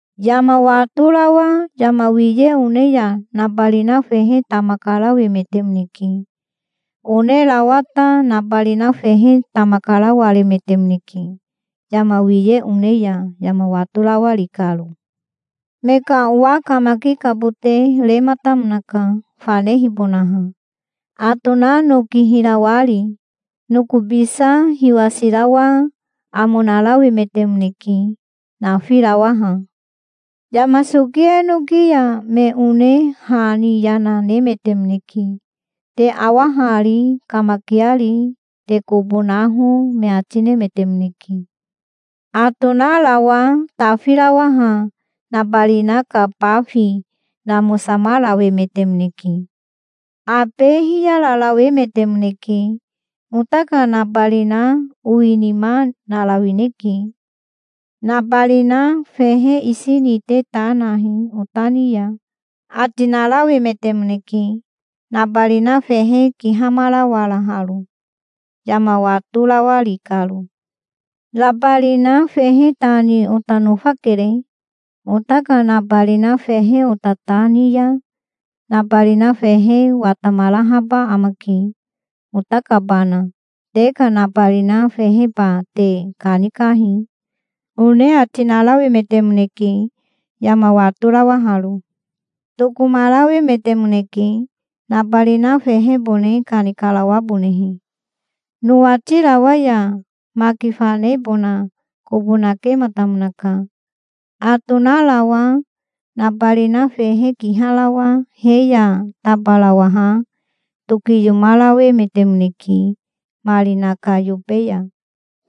Yama watorawa yama wiye one ya nabarina fehe tama karawemetemoneke. Onerawa ta nabarina fehe tama karawaremetemoneke, yama wiye one ya, yama watorawari karo. Me ka owa kamakikabote rematamonaka, fanehibonaha, atona noki hirawari. Nokobisa hiwasirawa amo narawemetemoneke, nafirawaha". "Yama soki enoki ya me one ha ni yana nemetemoneke. 'Te awa hari, kamakiari. Te kobo naho', me ati nemetemoneke". "Atonarawa tafirawaha nabarina ka bafi namosamarawemetemoneke. Abe hiyararawemetemoneke. 'Ota ka nabarina owinima narawineke. Nabarina fehe isi ni te ta nahi ota ni ya', ati narawemetemoneke, nabarina fehe kihamarawaraharo, yama watorawari karo". "'Nabarina fehe ta ni ota nofakere. Ota ka nabarina fehe ota ta ni ya nabarina fehe watamarahaba amake, ota kabana. Te ka nabarina feheba te kanikahi', one ati narawemetemoneke, yama watorawaharo". "Tokomarawemetemoneke, nabarina fehebone kanikarawabonehe. Nowatirawa ya maki fanebona kobo nakematamonaka. Atonarawa nabarina fehe kiharawa he ya tabarawaha tokiyomarawemetemoneke marina ka yobe ya.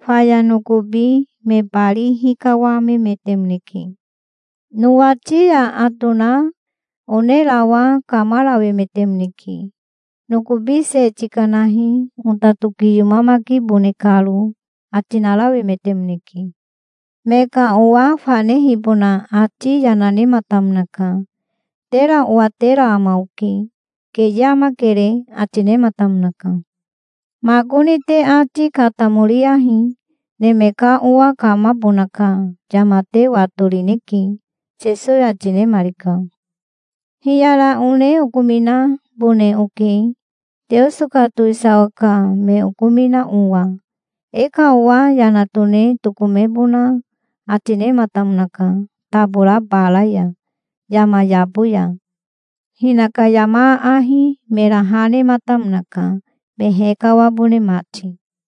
Faya nokobi me bari hikawamemetemoneke". "Nowati ya atona onerawa kamarawemetemoneke. 'Nokobi se tikanahi, ota tokiyomamakibone karo', ati narawemetemoneke". "Me ka owa fanehibona ati yana nematamonaka. 'Tera owatera ama oke. Keye amakere', ati nematamonaka". "Makoni te ati katamoriyahi. Neme ka Owa kamabona ka yama te watorineke", Sesowi ati nemarika. "Hiyara one okominabone oke, Teoso ka towisawa ka me okomina owa. E ka owa yana tone tokomebona ati nematamonaka tabora bara ya, yama yabo ya. Hinaka yama aahi mera ha nematamonaka, me hekawabone mati.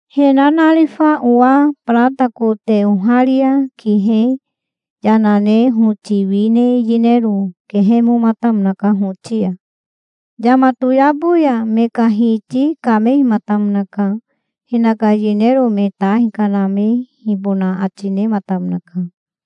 He nanarifa owa barata kote oharia kihe yana ne hoti wi ne yinero kehemomatamonaka hoti ya". "Yama toyabo ya me ka hiti kamehimatamonaka. Hinaka yinero me ta hikanamehibona ati nematamonaka.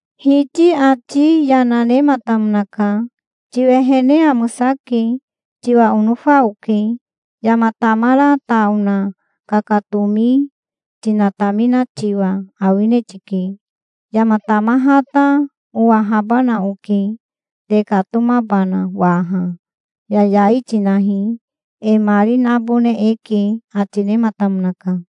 "Hiti ati yana nematamonaka. 'Tiwehene amosake. Tiwa onofa oke. Yama tamara ta ona kakatomi tinatamina tiwa awine tike. Yama tamaha ta owahabana oke, tekatomabana waha. Yayai tinahi. E mari nabone eke', ati nematamonaka".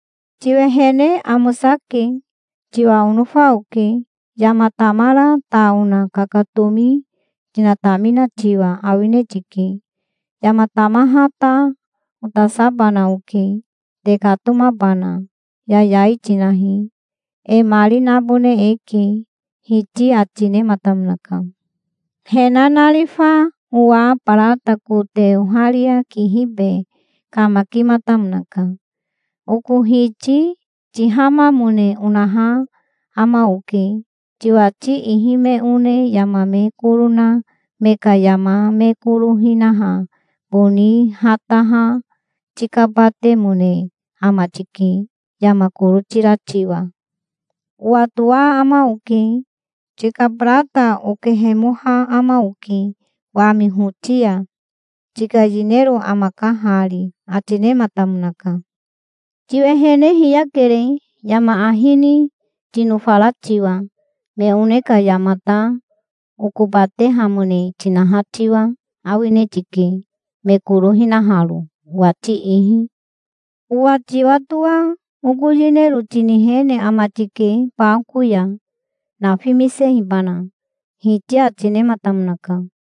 "'Tiwehene amosake. Tiwa onofa oke. Yama tamara ta ona kakatomi tinatamina tiwa awine tike. Yama tamaha ta otasabana oke, tekatomabana. Yayai tinahi. E mari nabone eke', hiti ati nematamonaka". "He nanarifa owa barata kote oharia kihibe kamakimatamonaka. 'Oko hiti tihamamone onaha ama oke. Tiwati ihi me one yama me koro na me ka yama me koro hinaha boni hataha tikabatemone ama tike, yama koro tira tiwa. Owatoa ama oke. Tika barata okehemoha ama oke wami hoti ya. Tika yinero amaka hari', ati nematamonaka". "'Tiwehene hiyakere, yama ahi ni tinofara tiwa. Me one ka yamata okobatehamone tinaha tiwa awine ti, me koro hinaharo, owati ihi? Owa tiwatoa oko yinero tinihene ama tike bako ya, nafimisehibana', hiti ati nematamonaka".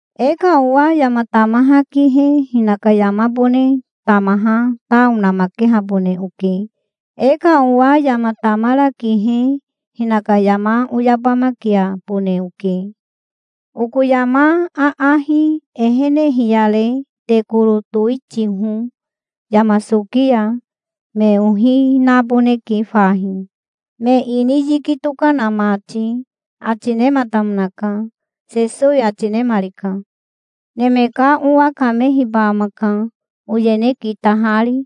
E ka owa yama tamaha kihe hinaka yamabone tamaha ta onamakehabone oke. E ka owa yama tamara kihe hinaka yama oyabamakiabone oke. Oko yama aahi ehene hiyare te koro towitiho yama soki ya. Me ohi naboneke fahi, me ini yiki tokana mati', ati nematamonaka", Sesowi ati nemarika. "Neme ka Owa kamehiba amaka, oyene kitahari,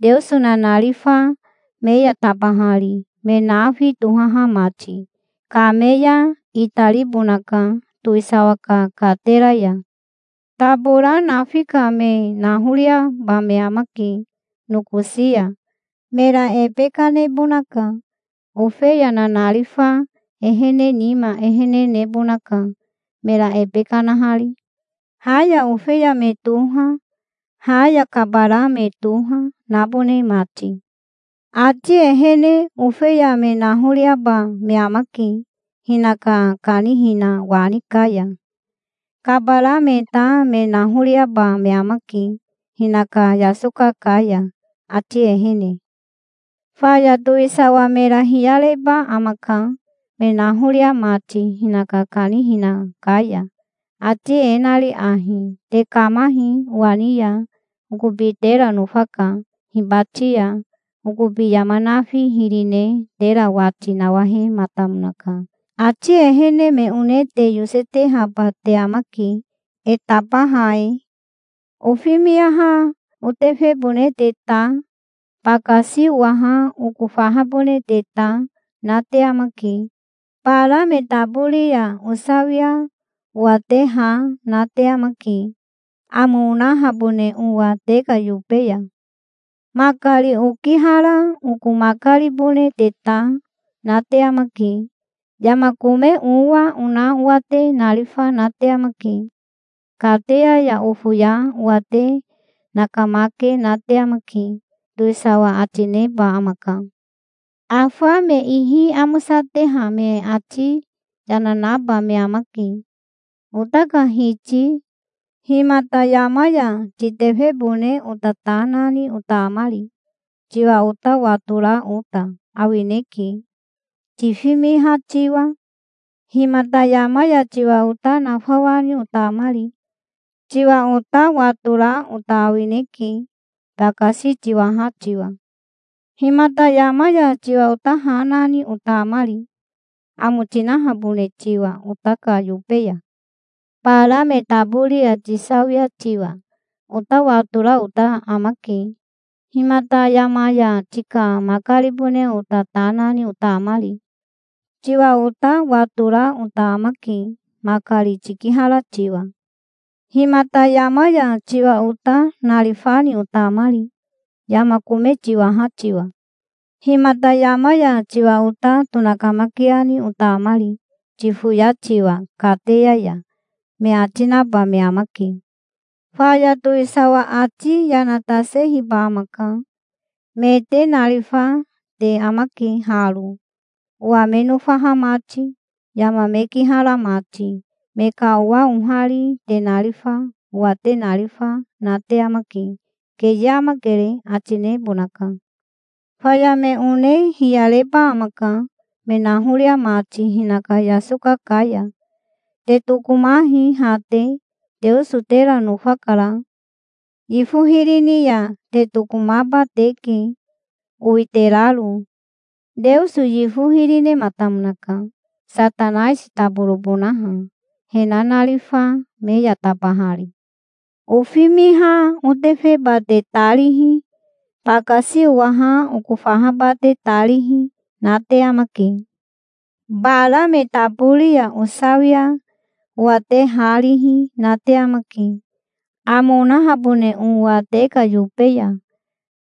Teoso nanarifa me ya tabahari, me nafi tohaha mati. Kame ya itaribonaka towisawa ka katera ya. Tabora nafi ka me nahoriaba me amake nokosi ya. Mera ebe kanebonaka. Ofeya nanarifa ehene nima ehene nebonaka, mera ebe kanahari, ha ya ofeya me toha, ha ya kabara me toha, nabone mati. Ati ehene ofeya me nahoriaba me amake hinaka kanihina wani ka ya. Kabara me ta me nahoriaba me amake hinaka yasoka ka ya, ati ehene. Faya towisawa mera hiyareba amaka, me nahoria mati hinaka kanihina ka ya, ati e nari ahi: 'Te kamahi owa ni ya. Okobi tera nofaka. Hibati ya okobi yama nafi hiri ne tera wati nawahematamonaka. Ati ehene me one te yosetehaba te amake, e tabaha e. Ofimiha otefebone te ta, bakasi owaha oko fahabone te ta, na te amake. Bara me tabori ya osawia owa te ha na te amake, amo onahabone owa te ka yobe ya. Makari okihara oko makaribone te ta, na te amake. Yama kome owa ona owa te narifa na te amake. Kateya ya ofoya owa te nakamake na te amake', towisawa ati neba amaka". "Afa me ihi amosateha me ati yana naba me amake. 'Ota ka Hiti, himata yama ya titefebone ota ta nani ota amari? Tiwa ota watora ota awineke, tifimiha tiwa. Himata yama ya tiwa ota nafawani ota amari? Tiwa ota watora ota awineke, bakasi tiwaha tiwa. Himata yama ya tiwa ota ha nani ota amari, amo tinahabone tiwa ota ka yobe ya? Bara me tabori ya tisawia tiwa ota watora ota amake. Himata yama ya tika makaribone ota ta nani ota amari? Tiwa ota watora ota amake, makari tikihara tiwa. Himata yama ya tiwa ota narifani ota amari, yama kome tiwaha tiwa? Himata yama ya tiwa ota tonakamakiani ota amari, tifoya tiwa kateya ya?' me ati naba me amake". "Faya towisawa ati yana tasehiba amaka. 'Me te narifa te amake haro, owa me nofaha mati, yama me kihara mati. Me ka owa ohari te narifa owa te narifa na te amake. Keye amakere', ati nebonaka". "Faya me one hiyareba amaka, me nahoria mati hinaka yasoka ka ya. 'Te tokomahi ha te. Teoso tera nofakara. Yifo hiri ni ya te tokomaba teke, owiteraro. Teoso yifo hiri nematamonaka, Satanaisi toborobonaha, he nanarifa me ya tabahari. Ofimiha otefeba te ta rihi, bakasi owaha oko fahaba te ta rihi, na te amake. Bara me tabori ya osawia owa te ha rihi na te amake, amo onahabone owa te ka yobe ya.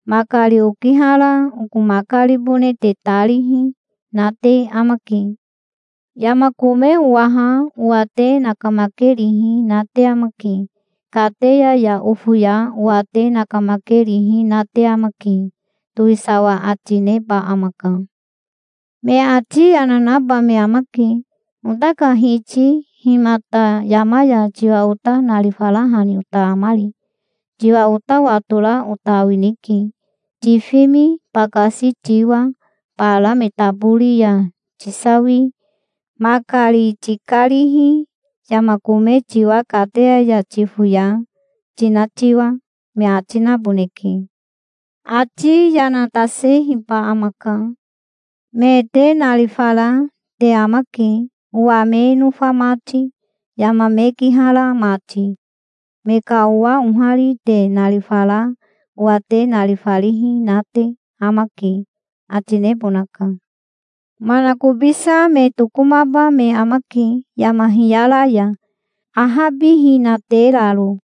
Makari okihara oko makaribone te ta rihi na te amake. Yama kome owaha owa te nakamakerihi na te amake. Kateya ya ofoya owa te nakamakerihi na te amake', towisawa ati neba amaka". "Me ati yana naba me amake. 'Ota ka Hiti himata yama ya tiwa ota narifarahani ota amari? Tiwa ota watora ota awineke, tifimi, bakasi tiwa, bara me tabori ya tisawi, makari tikarihi, yama kome tiwa, kateya ya tifoya, tina tiwa', me ati naboneke". "Ati yana tasehiba amaka. 'Me te narifara te amake, owa me nofa mati, yama me kihara mati. Me ka owa ohari te narifara owa te narifarihi na te amake', ati nebonaka. Manakobisa me tokomaba me amake yama hiyara ya, ahabihinateraro.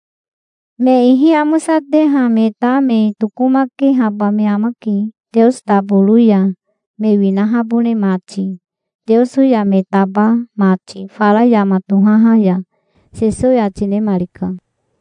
Me ihi amosateha me ta me tokomakehaba me amake Teoso taboro ya, me winahabone mati Teoso ya me taba mati fara yama tohaha ya", Sesowi ati nemarika.